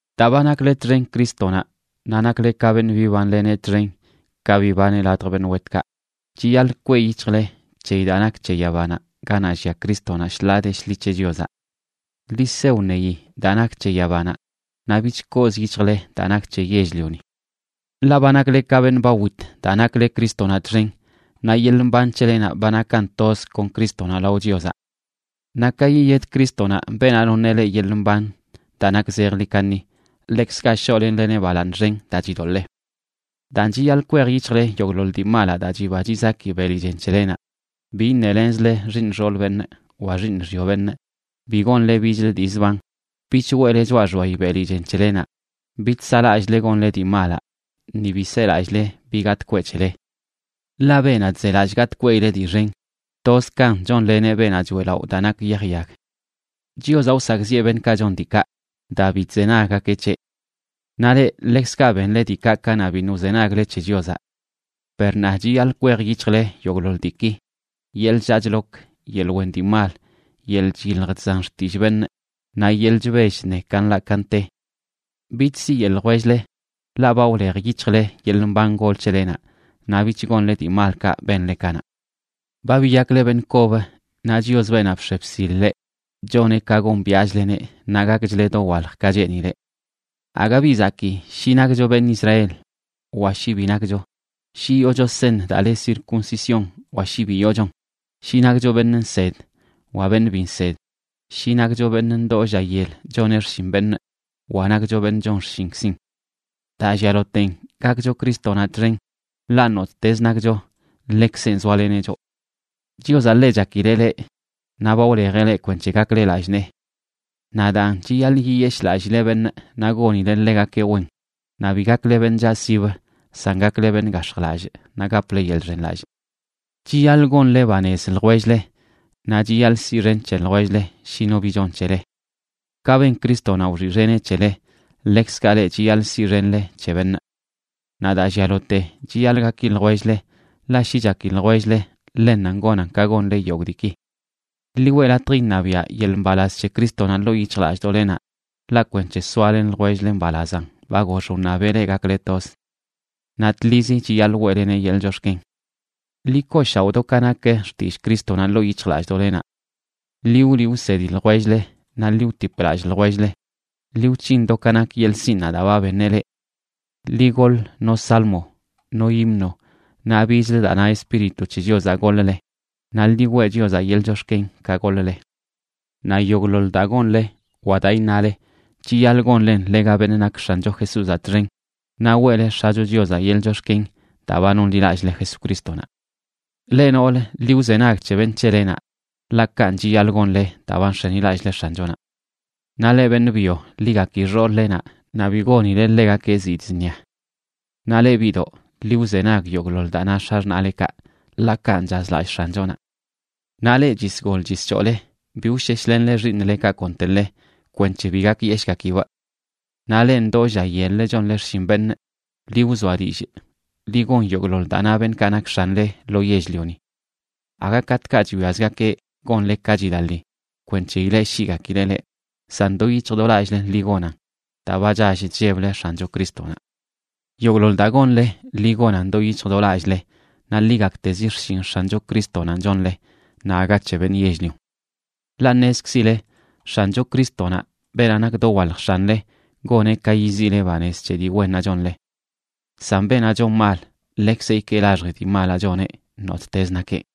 Daa ba nakle txen Crístonaꞌ naꞌ nakle ka beṉꞌ bibanleneꞌ txen ka bibaneꞌ ladj beṉꞌ wetkaꞌ, chiyaḻꞌ kweꞌ yic̱hjle c̱heyi daa nak c̱he yabanaꞌ, ganaꞌ llia Crístonaꞌ shḻaa de shḻi c̱he Chiozaꞌ. Ḻi se wṉeyi daa nak c̱he yabanaꞌ, naꞌ bich kooz yic̱hjle daa nak c̱he yell-lioni. Ḻaꞌ ba nakle ka beṉꞌ ba wit daa nakle Crístonaꞌ txen, naꞌ yeḻꞌ mban c̱helenaꞌ ba nakan toz kon Crístonaꞌ lao Chiozaꞌ. Naꞌ ka yiyed Crístonaꞌ, beenaꞌ noṉeꞌ leꞌ yeḻꞌ mban daa nak zejḻi kaṉi, ḻekzkaꞌ shoꞌlenleneꞌ balaaṉ xen daa chidoḻee. Daan, chiyaḻꞌ kwej yic̱hjle yogꞌḻoḻ dii malaꞌ daa chiba chizaki beli chen c̱helenaꞌ: bi iṉelenzle xiiṉ xool beṉꞌ wa xiiṉ xyo beṉꞌ, bi gonle bichlə dii zban, bich weꞌle choꞌa xbayi beli chen c̱helenaꞌ, bich saꞌlallꞌzle gonle dii malaꞌ, ni bi selallꞌle bi gatꞌ kweꞌ c̱hele. Ḻaꞌ beenaꞌ chzelallꞌ gatꞌ kweꞌileꞌ dii xen, toz kan chonleneꞌ beenaꞌ choeꞌlaꞌo daa nak yaj yag. Chiozaꞌ wsakꞌziꞌe beṉꞌkaꞌ chon diikaꞌ daa bi chzenaggakeꞌ c̱heꞌ. Naꞌ leꞌ, ḻekzkaꞌ benle diikaꞌ kanaꞌ biṉꞌ wzenagle c̱he Chiozaꞌ. Per ṉaa, chiyaḻꞌ kwej yic̱hjle yogꞌḻoḻ diiki: yeḻꞌ chllaa chlok, yeḻꞌ wen dii mal, yeḻꞌ chyilj chzan xtillꞌ beṉꞌ, naꞌ yeḻꞌ chbell chṉe ka nḻaꞌ ka nte. Bich siyeꞌ ljwell-le, ḻaꞌ ba wlej yic̱hjle yeḻꞌ mban gol c̱helenaꞌ naꞌ bich gonle dii malkaꞌ benle kanaꞌ. Ba biyakle beṉꞌ kob, naꞌ Chios, beenaꞌ bx̱e bsil leꞌ, choneꞌ ka gombiaꞌchleneꞌ naꞌ gakchle dowalj ka cheenileꞌ. Aga bi zakii shi nakcho beṉꞌ Israel wa shi bi nakcho, shi yoocho seṉ daa le circuncisión wa shi bi yoochon, shi nakcho beṉꞌ nsed wa beṉꞌ bi nsed, shi nakcho beṉꞌ ndoo lla yel choneꞌ xshin beṉꞌ wa nakcho beṉꞌ chon xshinkzin. Daa llialoten, gakcho Crístonaꞌ txen, ḻaꞌ nottezə nakcho ḻekzenꞌ zoaleneꞌ choꞌ. Chiozaꞌ ḻe chakileꞌ leꞌ naꞌ ba wlejeꞌ leꞌ kwenc̱he gakle lallꞌ nee. Naꞌ daan, chiyaḻꞌ yiyeshꞌlallile beṉꞌ naꞌ gonile ḻegakeꞌ wen, naꞌ bi gakle beṉꞌ chaꞌsib, san gakle beṉꞌ gax̱jlallꞌ, naꞌ gaple yeḻꞌ chxenlallꞌ. Chiyaḻꞌ gonle banez ljwell-le, naꞌ chiyaḻꞌ siꞌxen c̱he ljwell-le shi no bi chon c̱hele. Ka ben Crístonaꞌ wxiꞌxeneꞌ c̱hele, ḻekzkaꞌ leꞌ chiyaḻꞌ siꞌxenle c̱he beṉꞌ. Naꞌ daa llialote chiyaḻꞌ gaki ljwell-le, ḻaꞌ shi chaki ljwell-le, ḻennanꞌ gonan ka gonle yogꞌ diiki. Ḻi weꞌ latj iṉabiaꞌ yeḻꞌ mbalaz c̱he Crístonaꞌ ḻoo yic̱hjlallꞌdoꞌlenaꞌ, ḻaꞌ kwenc̱he soalen ljwell-le mbalazan ba gox wṉabeꞌ leꞌ gakle toz. Naꞌ tlizi chiyaḻꞌ weꞌleneꞌ yeḻꞌ chox̱ken. Ḻi kooshaoꞌ do ka nak xtillꞌ Crístonaꞌ ḻoo yic̱hjlallꞌdoꞌlenaꞌ. Ḻi wliꞌ wsedi ljwell-le naꞌ ḻi wtip lallꞌ ljwell-le, ḻi wc̱hin do ka nak yeḻꞌ sinꞌnaꞌ daa ba beṉeꞌ leꞌ. Ḻi goḻ no salmo, no himno, naꞌ bichlə daa na Espíritu c̱he Chiozaꞌ goḻ-le, naꞌ ḻi weꞌ Chiozaꞌ yeḻꞌ chox̱ken ka goḻ-le. Naꞌ yogꞌḻoḻ daa gonle wa daa iṉale, chiyaḻꞌ gonlen ḻega beṉꞌ nak X̱ancho Jesúzaꞌ txen naꞌ weꞌle X̱acho Chiozaꞌ yeḻꞌ chox̱ken daa ba nonḻilallꞌle Jesucrístonaꞌ. Leꞌ noolə, ḻi wzenag c̱he beṉꞌ c̱helenaꞌ, ḻaꞌ kanꞌ chiyaḻꞌ gonle daa ba nx̱enilallꞌle X̱anchonaꞌ. Naꞌ leꞌ beṉꞌ byo, ḻi gaki xool-lenaꞌ naꞌ bi gonile ḻegakeꞌ zidꞌ zṉia. Naꞌ leꞌ biꞌdoꞌ, ḻi wzenag yogꞌḻoḻ daa na x̱axṉaꞌlekaꞌ, ḻaꞌ kanꞌ chazlallꞌ X̱anchonaꞌ. Naꞌ leꞌ chisgol chischoole, bi wsheshlenle xiiṉlekaꞌ konteḻe, kwenc̱he bi gakyeshꞌgakibꞌ. Naꞌ leꞌ ndoo lla yel-le chonle xshin beṉꞌ, ḻi wzoa dillꞌ, ḻi gon yogꞌḻoḻ daa na beṉꞌkaꞌ nak x̱anle lo yell-lioni. Aga katꞌkaꞌ chwiazgakeꞌ gonle ka chilaḻi kwenc̱he ileꞌshiꞌgakileꞌ leꞌ, san do yic̱hj do lallꞌle ḻi gonan daa ba chall chlleble X̱ancho Crístonaꞌ. Yogꞌḻoḻ daa gonle, ḻi gonan do yic̱hj do lallꞌle naꞌ ḻi gaktezi xshin X̱ancho Crístonanꞌ chonle naꞌ aga c̱he beṉꞌ yell-lion. Ḻaꞌ ṉezkzile X̱ancho Crístonaꞌ, beenaꞌ nak dowalj X̱anle, goneꞌ ka yiziꞌle banez c̱he dii wennaꞌ chonle. San beenaꞌ chon mal, ḻekzeꞌ ikee laxji dii malaꞌ choneꞌ, nottezə nakeꞌ.